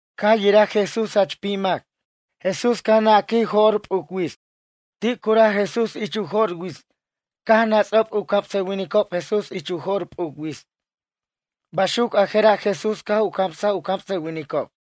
Caj yiraj Jesús jach pim mac. Jesús caj naquij jo'r p'uc wits. Ti' curaj Jesús ich u jo'r wits. Caj nats'ob u camsʌwinicob Jesús ich u jo'r p'uc wits. Baxuc a jera' Jesús caj u camsaj u camsʌwinicob.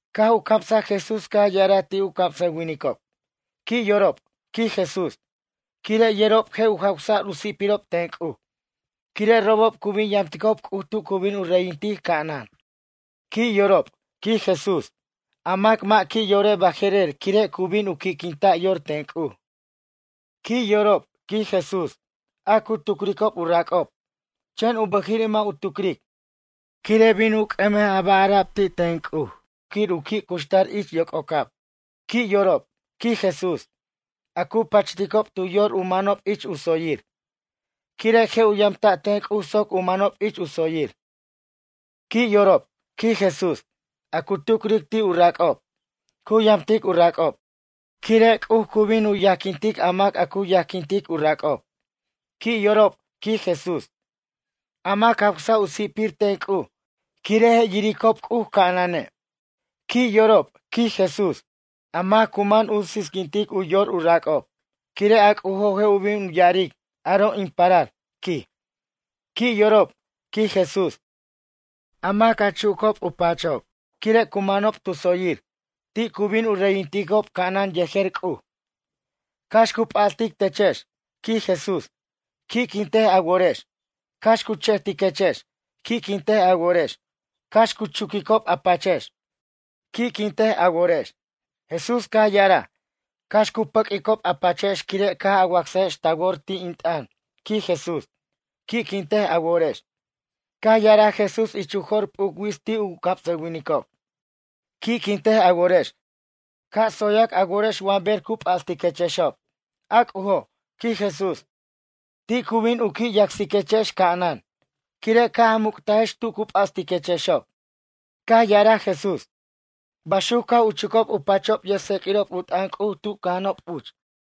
Caj u camsaj Jesús caj ya'araj ti' u camsʌwinicob: ―Qui' yorob ―quij Jesús―, quire' yerob je' u jawsa'r u si'pirob ten C'uj. Quire' robob cu bin yamticob C'uj tu cu bin u reyintic ca'anan. ’Qui' yorob ―quij Jesús―, a mac mʌ' qui' yore' baje'rer, quire' cu bin u qui'quinta' yor ten C'uj. ’Qui' yorob ―quij Jesús―, a cu tucricob u rac'ob. Chen u bʌjiri' mʌ' u tucric, quire' bin u c'ʌmej a ba' ara'b ti' ten C'uj quir u qui' cuxtar ich yoc'ocab. ’Qui' yorob ―quij Jesús―, a cu pachticob tu yor u manob ich u tsoyir. Quire' je' u yamta' ten C'uj soc u manob ich u tsoyir. ’Qui' yorob ―quij Jesús―, a cu tucric ti' u rac'ob, cu yamtic u rac'ob. Quire' C'uj cu bin u yajquintic a mac a cu yajquintic u rac'ob. ’Qui' yorob ―quij Jesús―, a mac jawsa' u si'pir ten C'uj. Quire' je' yiricob C'uj ca'anane'. ’Qui' yorob ―quij Jesús―, a mac cu man u sisquintic u yor u rac'ob. Quire' a C'ujo' je' bin ya'aric: “Aro' in parar” ―quij―. ’Qui' yorob ―quij Jesús―, a mac a chucob u pachob, quire' cu manob tu tsoyir. Ti' cu bin u reyinticob ca'anan yejer C'uj. ’Cax cu p'astic techex ―quij Jesús―, qui'quintej a worex. Cax cu che'tiquechex, qui'quintej a worex. Cax cu chuquicob a pachex, qui'quintej a worex. Jesús caj ya'araj: ―Cax cu pʌq'uicob a pachex quire' caj a wacsajex ta wor ti' in t'ʌn ―quij Jesús―. Qui'quintej a worex. Caj ya'araj Jesús ich u jo'r p'uc wits ti' u camsʌwinicob: ―Qui'quintej a worex, ca' tsoyac a worex wa ber cu p'astiquechexob. A C'ujo' ―quij Jesús―, ti' cu bin u qui' yacsiquechex ca'anan. Quire' caj a muctajex tu cu p'astiquechexob. Caj ya'araj Jesús: ―Baxuc caj u chucob u pachob yʌjtseq'uirob u t'ʌn C'uj tu cʌja'anob uch.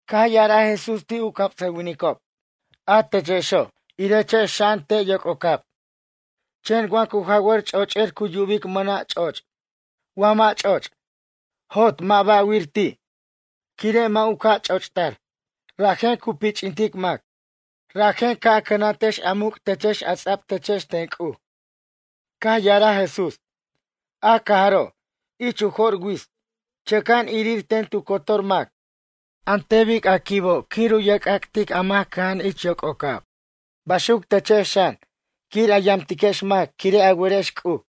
Caj ya'araj Jesús ti' u camsʌwinicob: ―A techexo', irechex xa'an te' yoc'ocab. Chen wa cu jawar ch'och'er cu yubic mʌna' ch'och'. Wa mʌ' ch'och', jot mʌ' ba'wir ti', quire' mʌ' u ca' ch'och'tar. Rajen cu pich'intic mac. Rajen ca' a cʌnantex a muc' techex a ts'a'b techex ten C'uj. Caj ya'araj Jesús: ―A cajaro', ich u jo'r wits, chʌca'an irir ten tu cotor mac. An ten bic a quibo' quir u yerc'ac'tic a mac cʌja'an ich yoc'ocab, baxuc techex xan, quir a yamtiquex mac quire' a werex C'uj.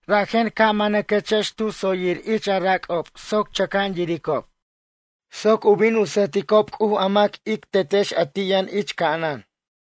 Rajen ca' manaquex tu tsoyir ich a rac'ob soc chʌca'an yiricob, soc u bin u sʌjticob C'uj a mac ic Tetex a ti' yʌn ich ca'anan.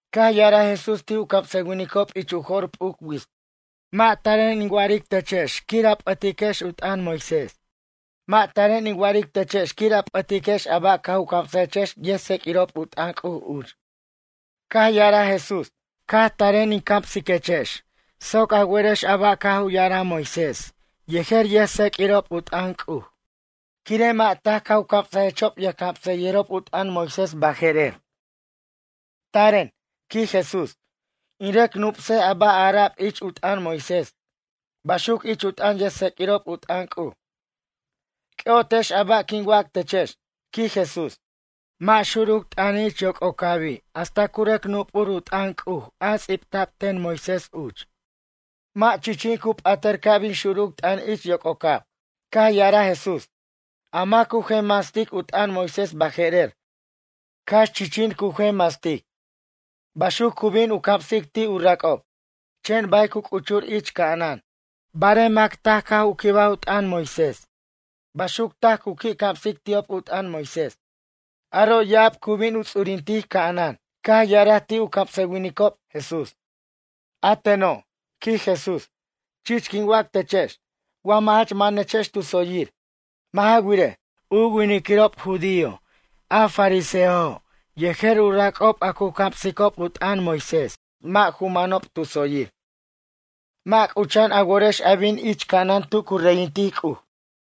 Caj ya'araj Jesús ti' u camsʌwinicob ich u jo'r p'uc wits: ―Mʌ' taren in wa'aric techex quir a p'ʌtiquex u t'ʌn Moisés. Mʌ' taren in wa'aric techex quir a p'ʌtiquex a ba' caj u camsajechex yʌjtseq'uirob u t'ʌn C'uj uch. Caj ya'araj Jesús: ―Caj taren in camsiquechex soc a werex a ba' caj u ya'araj Moisés yejer yʌjtseq'uirob u t'ʌn C'uj. Quire' mʌ' taj caj u camsechexob yʌjcamsayʌjirob u t'ʌn Moisés baje'rer. Taren ―quij Jesús―, in rʌc nup'sej a ba' ara'b ich u t'ʌn Moisés, baxuc ich u t'ʌn yʌjtseq'uirob u t'ʌn C'uj. C'ʌ'otex a ba' quin wac techex ―quij Jesús―. Mʌ' xuruc t'ʌni' ich yoc'ocabi' hasta cu rʌc nup'ur u t'ʌn C'uj a ts'ibta'b ten Moisés uch. Mʌ' chichin cu p'atar ca' bin xuruc t'ʌn ich yoc'ocab. Caj ya'araj Jesús: ―A mac cu jenmastic u t'ʌn Moisés baje'rer, cax chichin cu jenmastic. Baxuc cu bin u camsic ti' u rac'ob, chen bay cu c'uchur ich ca'anan. Barej mac taj caj u quibaj u t'ʌn Moisés. Baxuc taj cu qui' camsic ti'ob u t'ʌn Moisés. Aro' ya'ab cu bin u ts'urintic ca'anan. Caj ya'araj ti' u camsʌwinicob, Jesús: ―A teno' ―quij Jesús―. Chich quin wac techex. Wa mʌ' jach manex tu tsoyir. Mʌ' ja wirej, u winiquirob judío a fariseojo' yejer u rac'ob a cu camsicob u t'ʌn Moisés mʌ' ju manob tu tsoyir. Mʌ' c'ucha'an a worex a bin ich ca'anan tu cu reyintic C'uj.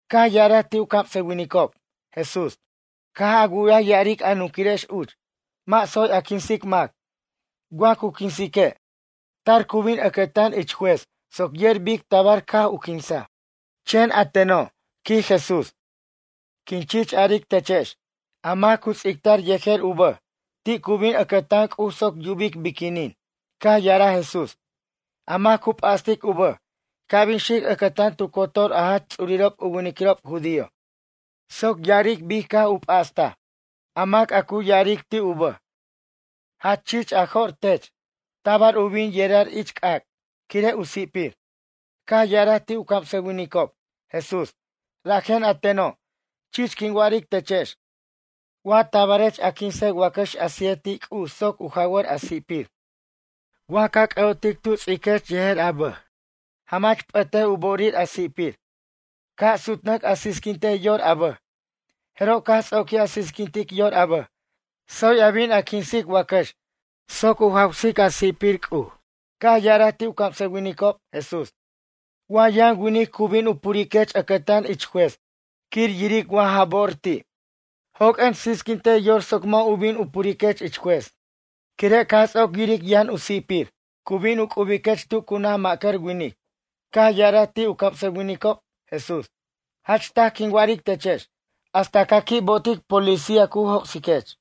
Caj ya'araj ti' u camsʌwinicob, Jesús: ―Caj a wu'yaj ya'aric a nunquirex uch: “Mʌ' tsoy a quinsic mac. Wa cu quinsique', tar cu bin ʌcʌtan ich juez soc yer bic tabar caj u quinsaj.” Chen a teno' ―quij Jesús―. Quin chich aric techex: A mac cu ts'ictar yejer u bʌj, ti' cu bin ʌcʌtan C'uj soc yubic biquinin. Caj ya'araj Jesús: ―A mac cu p'astic u bʌj, ca' bin xic ʌcʌtan tu cotor a jach ts'urirob u winiquirob judío soc ya'aric bic caj u p'astaj. A mac a cu ya'aric ti' u bʌj: “Jach chich a jo'r tech”, tabar u bin yerar ich c'ac', quire' u si'pir. Caj ya'araj ti' u camsʌwinicob, Jesús: ―Rajen a teno', chich quin wa'aric techex. Wa tabarech a quinsej wacax a sije ti' C'uj soc u jawar a si'pir. Wa ca c'ʌ'otic tu ts'iquech yejer a bʌj, jamach p'ʌtej u bo'orir a si'pir. Ca' sutnʌc a sisquintej yor a bʌj. Jeroj caj ts'oquij a sisquintic yor a bʌj, tsoy a bin a quinsic wacax soc u jawsic a si'pir C'uj. Caj ya'araj ti' u camsʌwinicob, Jesús: ―Wa yʌn winic cu bin u puriquech ʌcʌtan ich juez quir yiric wa ja bo'or ti'. Joq'uen sisquintej yor soc mʌ' u bin u puriquech ich juez. Quire' caj ts'oc yiric yʌn a si'pir, cu bin u c'ubiquech tu cu naj ma'cʌr winic. Caj ya'araj ti' u camsʌwinicob, Jesús: ―Jach taj quin wa'aric techex: Hasta ca qui' bo'otic policía cu joc'siquech.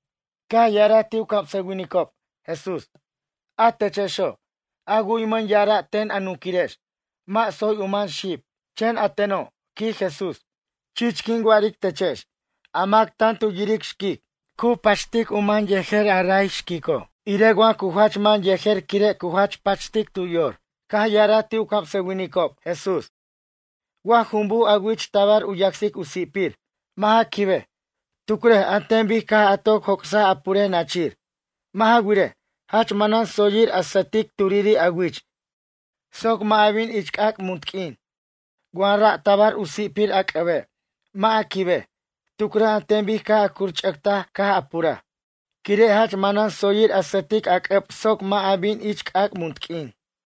Caj ya'araj ti' u camsʌwinicob, Jesús: ―A techexo', a wu'ymʌn ya'ara' ten a nunquirex: “Mʌ' tsoy u man xib.” Chen a teno' ―quij Jesús―. Chich quin wa'aric techex: A mac tan tu yiric xquic. Cu pachtej u man yejer ra' xquico', irej wa cu jach man yejer quire' cu jach pachtic yor. Caj ya'araj ti' u camsʌwinicob, Jesús: ―Wa jumbuj a wich tabar u yacsic a si'pir, mʌ' ja quibej. Tucrej an ten bic caj a toc joc'saj a purej nachir. Mʌ' ja wirej, jach manan tsoyir a sʌtic turiri' a wich soc mʌ' a bin ich c'ac' munt q'uin. Wa ra' tabar u si'pir a c'ʌbe', mʌ' a quibej. Tucrej an ten bic caj a curch'ʌctaj caj a puraj. Quire' jach manan tsoyir a sʌtic a c'ʌb soc mʌ' a bin ich c'ac' munt q'uin.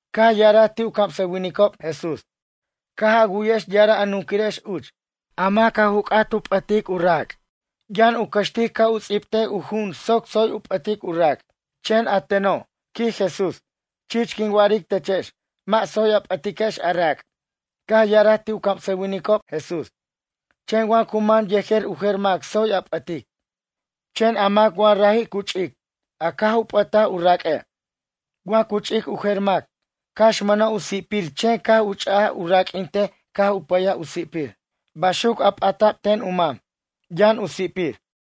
Caj ya'araj ti' u camsʌwinicob, Jesús: ―Caj a wu'yex ya'ara' a nunquirex uch: “A mac a u c'at u p'ʌtic u rac'. Yʌn u cʌxtic ca' u ts'ibtej u ju'un soc tsoy u p'ʌtic u rac'.” Chen a teno' ―quij Jesús―, chich quin wa'aric techex: Mʌ' tsoy a p'ʌtiquex a rac'. Caj ya'araj ti' u camsʌwinicob, Jesús: ―Chen wa cu man yejer u jer mac tsoy a p'ʌtic. Chen a mac wa raji' cu ch'ic, a caj u p'ʌtaj a raq'ue'. Wa cu ch'ic u jer mac, cax mʌna' u si'pir chen caj u ch'aj u raq'uintej caj u pʌyaj u si'pir. Baxuc a p'ata'b ten u mam, yʌn u si'pir.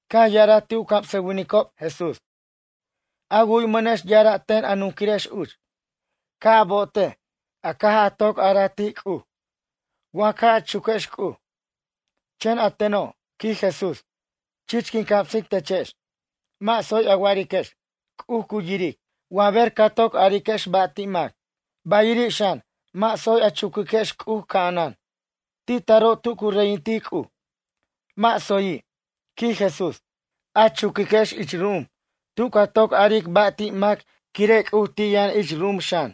Caj ya'araj ti' u camsʌwinicob, Jesús: ―A wu'ymʌnex ya'ara' ten a nunquirex uch: “Ca' a bo'otej, a caj a toc araj ti' C'uj, wa caj a chuquex C'uj.” Chen a teno' ―quij Jesús―, chich quin camsic techex; mʌ' tsoy a wa'ariquex: “C'uj cu yiric” wa ber ca toc ariquex ba' ti' mac. Ba'iri' xan: mʌ' tsoy a chuquex C'uj ca'anan, ti' taro' tu cu reyintic C'uj. Mʌ' tsoyi' ―quij Jesús―, a chuquiquex ich ru'um, tu ca toc aric ba' ti' mac quire' C'uj ti' yʌn ich ru'um xan.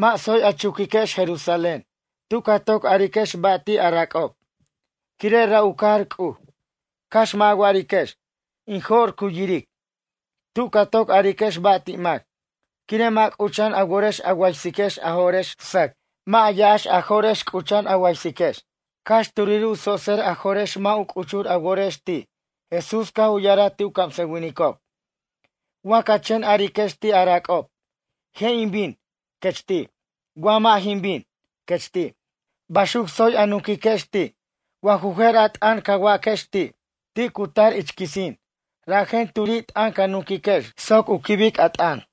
Mʌ' tsoy a chuquiquex Jerusalén, tu ca toc ariquechex ba' ti' a rac'ob, quire' ra' u cajar C'uj. Cax mʌ' a wa'ariquex: “In jo'r cu yiric” tu ca toc ariquex ba' ti' mac. Quire' mʌ' c'ucha'an a worex a waysiquex a jo'rex sʌc, mʌ' ya'ax a jo'rex c'ucha'an a waysiquex. Cax turi' u tsotser a jo'rex mʌ' u c'uchur a worex ti'. Jesús caj u ya'araj ti' u camsʌwinicob: ―Wa ca chen ariquex ti' a rac'ob: “Je' in bin” ―quech ti'―, wa “mʌ' jin bin” ―quech ti'―. Baxuc tsoy a nunquiquex ti'. Wa ju jer a t'ʌn ca waquex ti', ti' cu tar ich quisin. Rajen turi' t'ʌn ca nunquiquex soc u quibic a t'ʌn.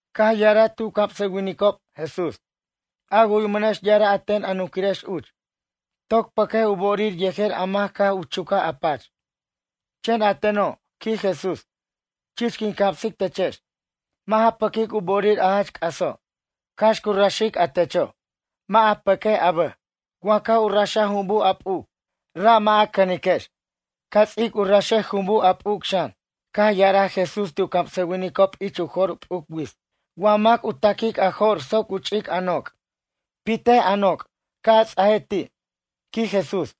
Caj ya'araj ti' u camsʌwinicob, Jesús: ―A wu'ymʌnex ya'ara' ten a nunquirex uch: “Toc pʌquej u bo'orir yejer a mac caj u chucaj a pach.” Chen a teno' ―quij Jesús―, chich quin camsic techex: Mʌ' ja pʌquic u bo'orir a jach c'aso', cax cu raxic a techo'. Mʌ' a pʌquej a bʌj. Wa caj u raxaj jumbuj a p'uc. Ra' mʌ' a cʌniquex. Ca ts'ic u raxej jumbuj a p'uc xan. Caj ya'araj Jesús ti' u camsʌwinicob ich u jo'r p'uc wits: ―Wa mac u ta'quic a jo'r soc u ch'ic a noc'. Pitej a noc', ca' a ts'aj ti' ―quij Jesús―,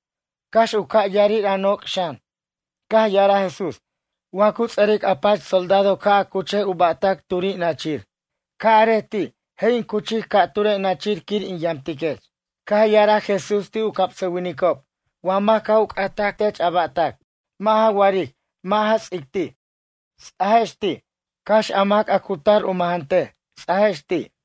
cax u ca' ya'arir a noc' xan. Caj ya'araj Jesús: ―Wa cu ts'ʌric a pach soldado ca' a cuchej u ba'tac turi' nachir. Ca' arej ti': “Je' in cuchic ca'ture' nachir quir in yamtiquech.” Caj ya'araj Jesús ti' u camsʌwinicob: ―Wa mac caj u c'ataj tech a ba'tac. Mʌ' ja wa'aric mʌ' ja ts'ic ti'. Ts'ajex ti', cax a mac a cu tar u majantej. Ts'ajex ti'.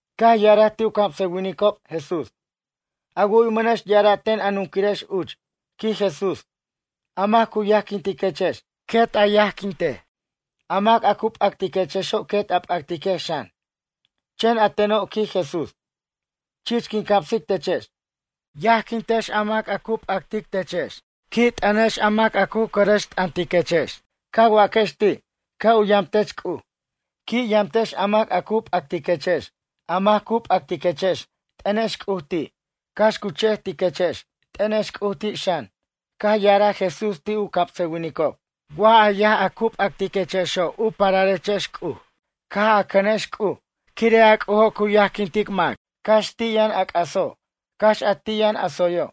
Caj ya'araj ti' u camsʌwinicob, Jesús: ―A wu'ymʌnex ya'ara' ten a nunquirex uch ―quij Jesús―: “A mac cu yajquintiquex, quet yajquintej. A mac a cu p'actiquexo' quet a p'actiquex xan.” Chen a teno' ―quij Jesús―, chich quin camsic techex. Yajquintex a mac cu p'actic techex. Qui' t'ʌnex a mac a cu cʌrʌxt'ʌntiquex. Ca waquex ti': “Ca' u yamtech C'uj.” Qui' yamtex a mac a cu p'actiquechex. A mac cu p'actiquechex, t'ʌnex C'uj ti'. Cax cu che'tiquechex, t'ʌnex C'uj ti' xan. Caj ya'araj Jesús ti' u camsʌwinicob: ―Wa ca yaj a cu p'actiquechexo' u pararechex C'uj, caj a cʌnex C'uj. Quire' a C'ujo' cu yajquintic mac, cax ti' yʌn a c'aso', cax a ti' yʌn a tsoyo'.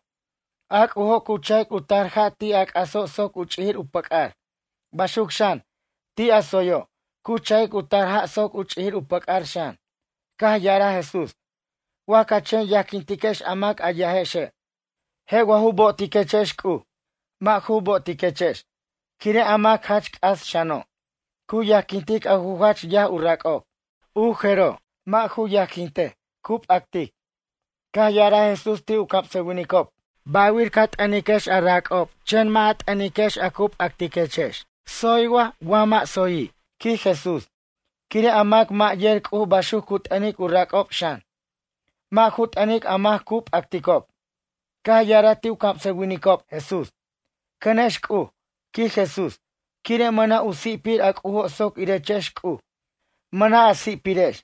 A C'ujo' cu cha'ic u tar ja' ti' a c'aso' soc u ch'ijir u pʌc'ar. Baxuc xan, ti' a tsoyo', cu cha'ic u tar ja' soc u ch'ijir u pʌc'ar xan. Caj ya'araj Jesús: ―Wa ca chen yajquintiquex a mac a yajexe'. Je' wa ju bo'otiquechex C'uj. Mʌ' ju bo'otiquechex, quire' a mac jach c'as xano', cu yajquintic a ju jach yaj u rac'ob. U jeroj, mʌ' ju yajquintej, cu p'actic. Caj ya'araj Jesús ti' u camsʌwinicob: ―Ba'wir ca t'ʌniquex a rac'ob chen mʌ' a t'ʌniquex a cu p'actiquechex. Tsoy wa mʌ' a tsoyi'? ―quij Jesús―. Quire' a mac mʌ' yer C'uj baxuc cu t'ʌnic u rac'ob xan, mʌ' ju t'ʌnic a mac cu p'acticob. Caj ya'araj ti' u camsʌwinicob, Jesús: ―Cʌnex C'uj ―quij Jesús―. Quire mʌna' u si'pir a C'ujo' soc irechex C'uj, mʌna' a si'pirex.